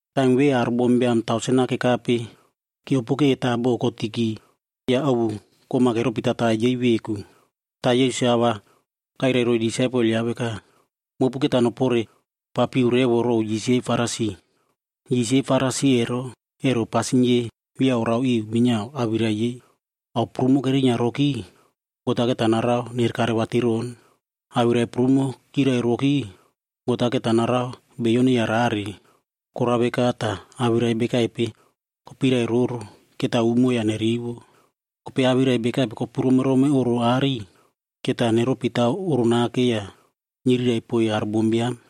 Taim ve aro bombiam tausen-a kekape kyiopoke ta bo kotiki ya ovu kom-a keropi tatai yei veku. Ta Yesus-a a va kairai roiy disaipel yaꞌa veka, “Mopu keta noporepapiu revo row yis yei Farisi. Yis yei Farisi ero, ero pasin yei via orao iu minyiao awirai yei. Ao prumo kerinyia roki, God-a keta narao nerekare vatiron. Awirai prumo kyirai roki, God-a keta narao beiyo neyarare. Korao veka ta awirai bekaipe kopirai roro, keta umo ya nerivo. Kopei awirai bekaipe kopu romerome oꞌro aꞌari, keta neropi taw oꞌro nake ya nyirirai poiy aro bombiam.”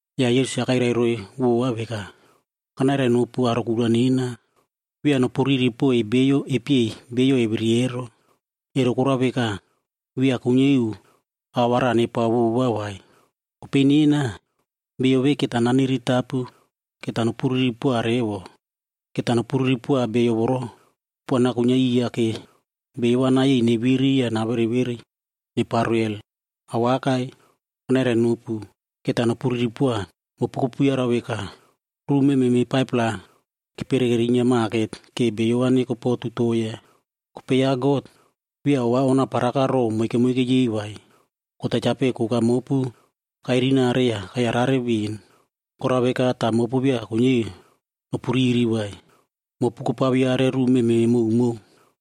Ya Yesus-a kairai roiy vova veka, “Kanairainopu aro kura nena, via nopuriri poiy beiyo epyei beiyo eviri ero.a Ero korao veka, via kuinyia iu ao va raꞌa nepao vova vai. Kopei nena, bio ve keta naniritapu keta nopuriri poa revo. Keta nopuriri poa bio voro kupuana kuinyia iya ke beiyo va nayei neviri ya navereverei neparo hel. Awakai! Kanairainopu, keta nopuriri poa. Mopu kopuyarau veka, ruꞌu mememe 5-pla kepere kerinyia maket ke beiyo va neko po 2-toea kanapo. Kopei ya God, via ova onaparaka row moike moike yei vai? God-a chapeꞌe koka mopu kairinare ya kayarare ven. Korao veka ta mopu via kuinyia iu nopuriri vai, mopu kopaviare ruꞌu mememe mowmow.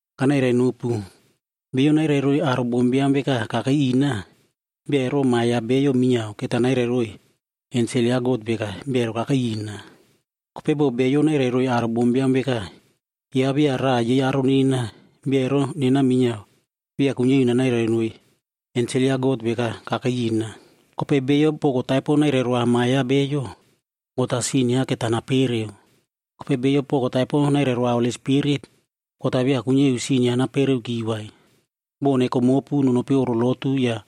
“Kanairainopu, bio nairai roiy aro bombiam veka kakei ina, bia ero Ma ya Bio minyiao keta nairai roiy ensel ya God veka bia ero kakei ina. Kopei bo bio nairai roiy aro bombiam veka, yaꞌa via raꞌa yei aro nena, bia ero nena minyiao via kuinyia iu nanairai noiy ensel ya God veka kakei ina. Kopei bio poko taipo nairairoa Ma yaꞌa Beiyo, God-a sin yaꞌa keta napereo. Kopei bio poko taipo nairairoa Holi Spirit, God-a via kuinyia iu sin yaꞌa napereoki. “Bo neko mopu nonopi oꞌro lotu ya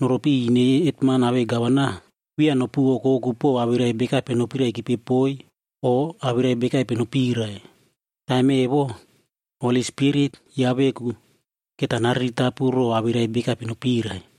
noropi iꞌiy ine yei hetman awei gavana, via nopu okoku pow awirai bekaipe nopiraikipe poiy o awirai bekaipe nopirai. Taim evo, Holi Spirit yaꞌa veku keta nariritapu row awirai bekaipe nopirai.”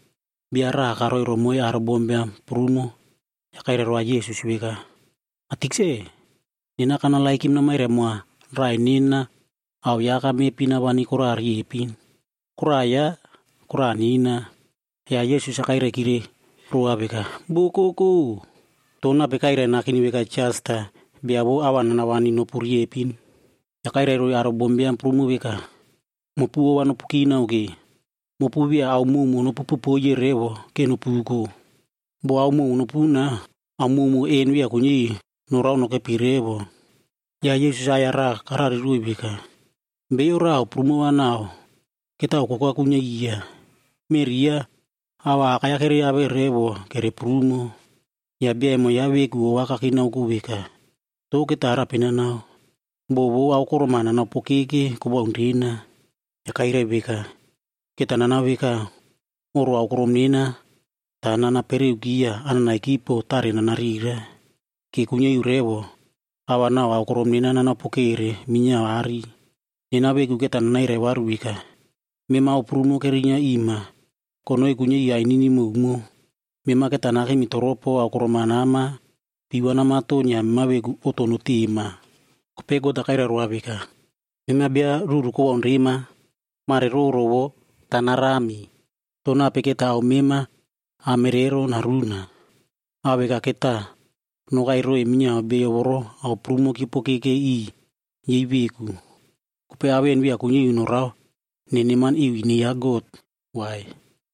Bia raꞌa karoi romoiy aro bombiam prumo ya kairai roa Yesus veka, “Ma Tikse, nena kanerenoma namairai moa raꞌai nena ao yaꞌa aka mepi nawani koraꞌa riepin. Koraꞌa yaꞌa, koraꞌa nena.” Ya Yesus-a kairaikire roa veka, “Bokoko! To nape kairai nakeni veka jas ta bia vou ao va nanawani nopu riepin?” Ya kairai roiy aro bombiam prumo veka, “Mopu ova nopu kinao ke! Mopu via ao mowmow nopu popoiye revo ke nopuko. Bo ao mowmow nopuna, ao mowmow en via kuinyia iu norao nokepi revo.” Ya Yesus-a aꞌai-ya raꞌa karariroiy veka, “Beiyo raꞌa ao prumo va nau ketao koka kuinyia iya. Meꞌri yaꞌa ao va akai-ya kereave revo kere prumo. Ya bia emo yaꞌa veku ova kakinaoko veka, ‘To keta arape nanao? Bo vou aokorom-a nanaopokeke kowaun rena.’ “Ya kairai veka, ‘Keta nanao veka, oꞌro aokorom nena ta nanapereuki ya anaꞌnaiki po tare nanarira. Ke nuinyiaiu revo ao va nau aokorom nena nanaopokere minyiao aꞌari. Nena veku keta nanairai varu veka, “Mema ao prumo kerinyia ima konoi kuinyia iu ainini mowmow. Mema keta nakemi toropo aokorom-a nama pii va namaton ya mema veku oꞌto notema.” ’ “Kopei God-a kairai roa veka, ‘Mema bia ruru kowaun rema! Mare roro vo ta narami. To nape keta ao mema amere ero naruna?’ “Ao veka keta nokai roiy minyiao beiyo voro ao prumo kyiopokeke iꞌiy yei veku. Kopei ao en via kuinyia iu norao neneman iu ine ya God vai.”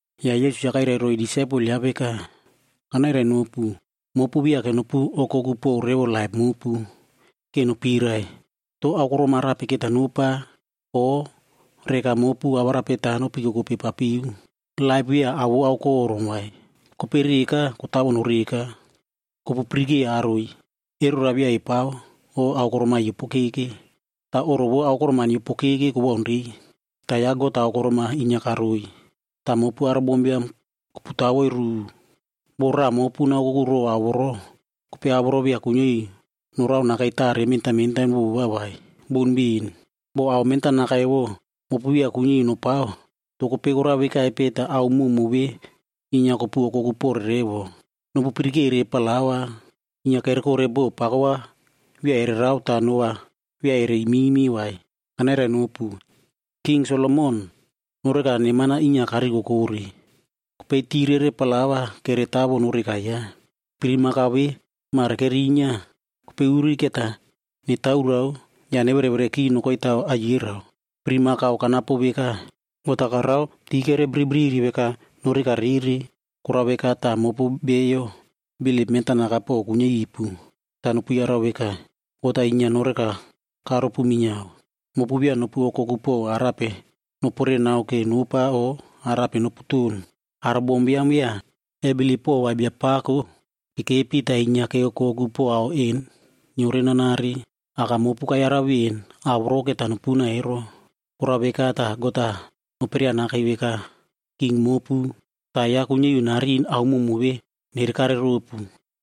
Ya Yesus-a kairai roiy disaipel yaꞌa veka, “Kanairainopu, mopu viake nopu okoku pow revo laip mopu, ke nopirai, to aokorom arape keta nopa, o reka mopu awarape ta nopikokope papiu. Laip via ao vou aokorom vai, kopei reka kotawo noreka. Kopu pirikei aroi, erora via epao o aokorom-a yiopokeke. Ta oꞌro vou aokorom-a nyiopokeke kowaunrei, ta ya God-a aokorom-a inyia karoiy. Ta mopu aro bombiam kopu tawoi ruꞌu. Bo raꞌa mopu naokoku row ao voro, kopei ao voro via kuinyia iu norao nakei tare mentan mentan vova vai. Boun ben! Bo ao mentanaka evo mopu via kuinyia iu nopao, to kopei korao vekaipe ta ao mowmow ve inyia kopu okoku pore revo? “Nopu pirikere plaua, inyia kerekore bo pako va via ererao ta no va via ere imime vai. Kanairainopu, King Solomon noreka neman-a inyia karikokore. Kopei ti rere plaua kere kotawo noreka yaꞌa. Pirimakao ve mare kerinyia, kopei uri keta netaorao ya neverevereki nokoi taw aiyerao. Pirimakao kanapo veka, God-a karao ti kere bribriri veka noreka rere. Korao veka ta mopu beiyo bilip mentanaka po kuinyia ipu, ta nopu yarau veka, God-a inyia noreka karopu minyiao. Mopu via nopu okoku po arape noporenao ke nopa o arape noputon. Aro bombiam via ebilip pova Biapako, kekepi ta inyia keokoku po ao en nyiorenanare. Aka mopu kayarau ven ao voro keta nopuna ero. Korao veka ta God-a noperia nakei veka king mopu. Ta yaꞌa kuinyia iu narin ao mowmow ve nerekare ropu.”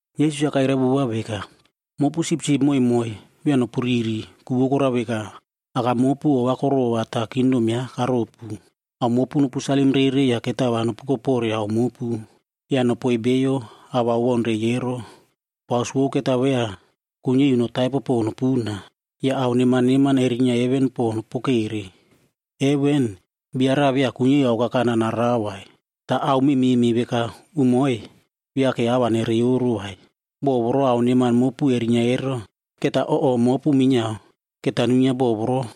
Yesus-a kairai vova veka, “Mopu sipsip moimoi, via nopuriri, ku vou korao veka, Aka mopu ova korova ta kingdom yaꞌa karopu. Ao mopu nopu salim rere ya ketao va nopuko pore ao mopu. Ya nopoiy beiyo ao va owaunrei ero. Paus vou ketao via kuinyia iu notaipo po nopuna. Ya ao neman neman erinyia heven po nopokere. Heven, bia raꞌa via kuinyia iu aokakana narao vai, ta ao mememe veka umoi via ke ao va nereyoro vai. Bo voro ao neman mopu erinyia ero, keta oꞌo mopu minyiao keta nuinyia bo voro.”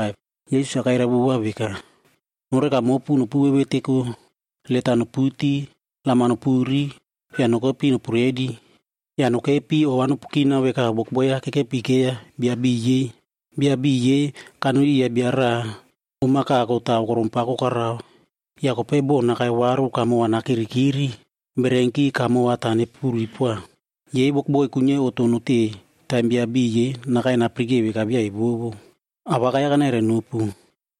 Yesus-a kairai vova veka, “Noreka mopu nopu veveteko, let-a noputi, lam-a nopuri ya nokepi nopu redi. Ya nokepi ova nopu kinao veka wokboi-ya kekepikeiya bia beiy yei. Bia beiy yei kanoi iya bia raꞌa om-a kako ta aokorom pako karao. Ya kopei bo nakai varu kamo va nakirikiri, bererenki kamo va ta nepuri poa. Yei wokboi kuinyia iu oꞌto notei taim bia beiy yei nakai napirikei veka via evovo. Awakai-ya kanairai nopu,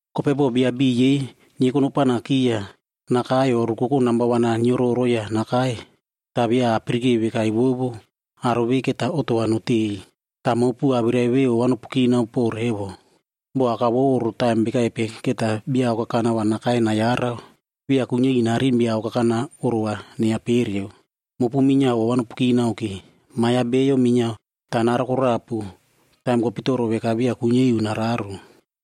Kopei bo bia beiy yei nyieko nopanaki ya nakai o rukoko namba wan-a nyiororo ya nakai, ta via apirikei veka evovo, aro ve keta oꞌto va notei. “Ta mopu awirai ve ova nopu kinao po revo. Bo aka vou oꞌro taim bekaipe keta bia aokakana va nakai nayarau, via kuinyia iu narin bia aokakana oꞌro va neyapereu. Mopu minyiao ova nopu kinao ke. Ma ya Bio minyiao ta narokorapu taim kopitoro veka via kuinyia iu nararo.”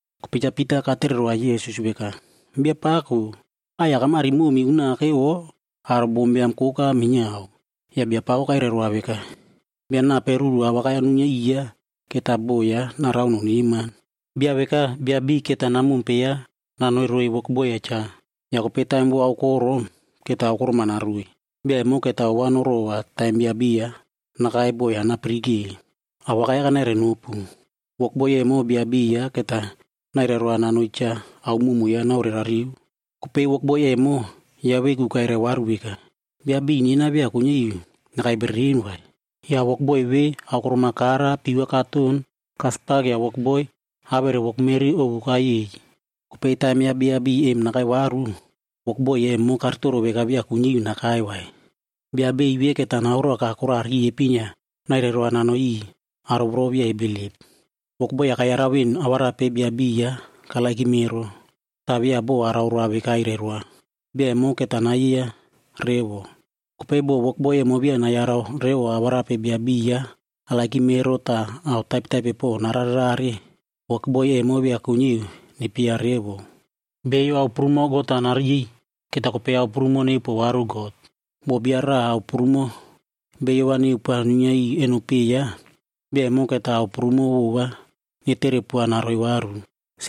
Kopei Cha Pita katere roa Yesus veka, “Biapako, aꞌai-ya kamari momi unake o aro bombiam koka minyiao?” Ya Biapako kairai roa veka, “Bia nape ruru awakai-ya nuinyia iya keta bo yaꞌa narao noneman? Bia veka bia beiy keta namompe yaꞌa nanoi roiy wokboi-ya cha. Ya kopei taim vou aokorom, keta aokorom-a naroiy. Bia emo keta ova norova taim bia beiy-a nakai bo yaꞌa napirike. Awakai-ya kanairai nopu, wokboi emo bia beiy yaꞌa keta nairai roa nanoi cha ao mowmow yaꞌa naorerariu. Kopei wokboi emo, yaꞌa veku kairai varu veka, ‘Bia beiy nena via kuinyia iu nakai bereren vai.’ Ya wokboi ve aokorom-a kara pii va katon kaspak ya wokboi awere wokmeri ovu kayei. Kopei taim ya bia beiy em nakai varu, wokboi emo karitoro veka via kuinyia iu nakai vai. Bia beiy ve keta naoroaka koraꞌa riepin ya nairai roa nanoi iꞌiy aro voro via ebilip. “Wokboi-ya kayarau ven awarape bia beiy yaꞌa karererow ero. Ta via bo araoroa veka airai roa. Bia emo keta nayeiya revo. Kopei bo wokboi emo via nayarau revo awarape bia beiy yaꞌa arererow ero ta ao taipetaipe po nararerare, wokboi emo via kuinyia iu nepyeiya revo. Beiyo ao prumo God-a nariy, keta kopei ao prumo neupoa varu God. Bo bia raꞌa ao prumo beiyo va neupoa nuinyia eno peꞌe yaꞌa, bia emo keta ao prumo vova neterepoa naroiy varu.”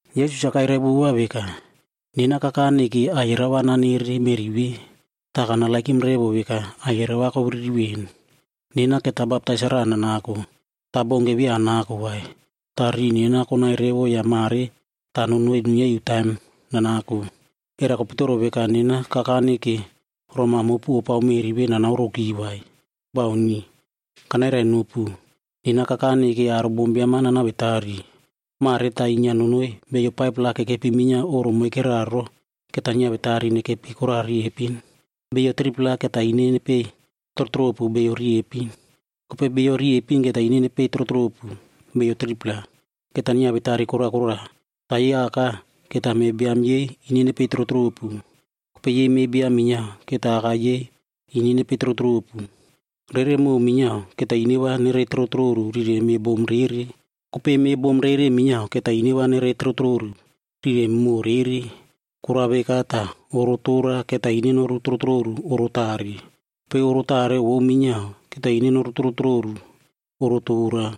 Yesus-a kairai vova veka, “Nena kakane ke aiyerao va nanere meꞌri ve, ta kanerenow revo veka aiyerao va koviriri ven. Nena keta baptais-a raꞌa nanako.c Ta baunke via anako vai, ta riꞌi nena konai revo ya mare ta nonoi nuinyia iu taim nanako. Era kopitoro veka nena kakane ke roma mopu opao meꞌri ve nanaoroki vai? Bauni! Kanairainopu, nena kakane ke aro bombiam-a nanawetari. Mare ta inyia nonoi beiyo 5-pla kekepi minyiao oꞌro moikera ro keta nyiawetari nekepi koraꞌa riepin. Beiyo 3-pla keta ine nepei trotropu beiyo riepin, kopei beiyo riepin keta ine nepei trotropu beiyo 3-pla. Keta nyiawetari kora kora, ta yei aka keta meꞌe biam yei ine nepei trotropu, kopei yei meꞌe biam minyiao keta aka yei ine nepei trotropu. Rere moꞌo minyiao keta ine va nerei trotroru rire meꞌe bom rere, kopei meꞌe bom rere minyiao keta ine va nerei trotroru rire moꞌo rere. Korao veka ta oꞌoro tora keta ine noru trotroru oꞌoro tare, kopei oꞌoro tare vou minyiao keta ine noru trotroru oꞌoro tora.”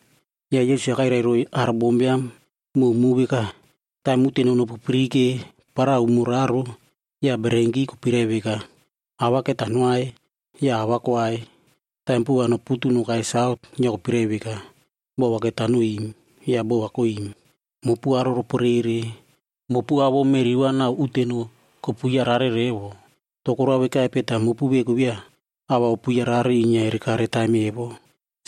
Ya Yesus-a kairai roiy aro bombiam mowmow veka, “Taim uteno nopupirike para umo raro, ya bererenki kopirai veka, ‘Aꞌ va keta noai,’ ya aꞌ va koai. Taim puꞌu va noputu nokai saut, ya kopirai veka, ‘Bo va keta noim,’ ya bo va koim. Mopu aro roporere! Mopu ao vou meꞌri va nau uteno kopu yarare revo. To korao vekaipe ta mopu veku via ao va opu yarare inyia erekare taim evo?”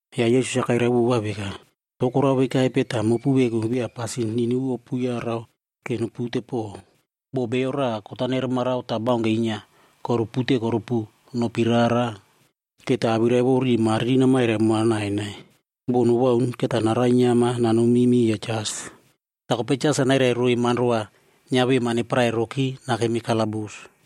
Ya Yesus-a kairai vova veka, “To korao vekaipe ta mopu veku via pasin niniu opu yarau ke nopute pow? Bo bio raꞌa kot-a neremarao ta baunke inyia korupute korupu nopi rara, keta awirai vou riꞌi mariri namairai moa nainai. Bo nowaun, keta narainyiama nanomi miya jas. Ta kopei jas-a nairai roiy manro va nyiavema neparai roki nakemi kalabus.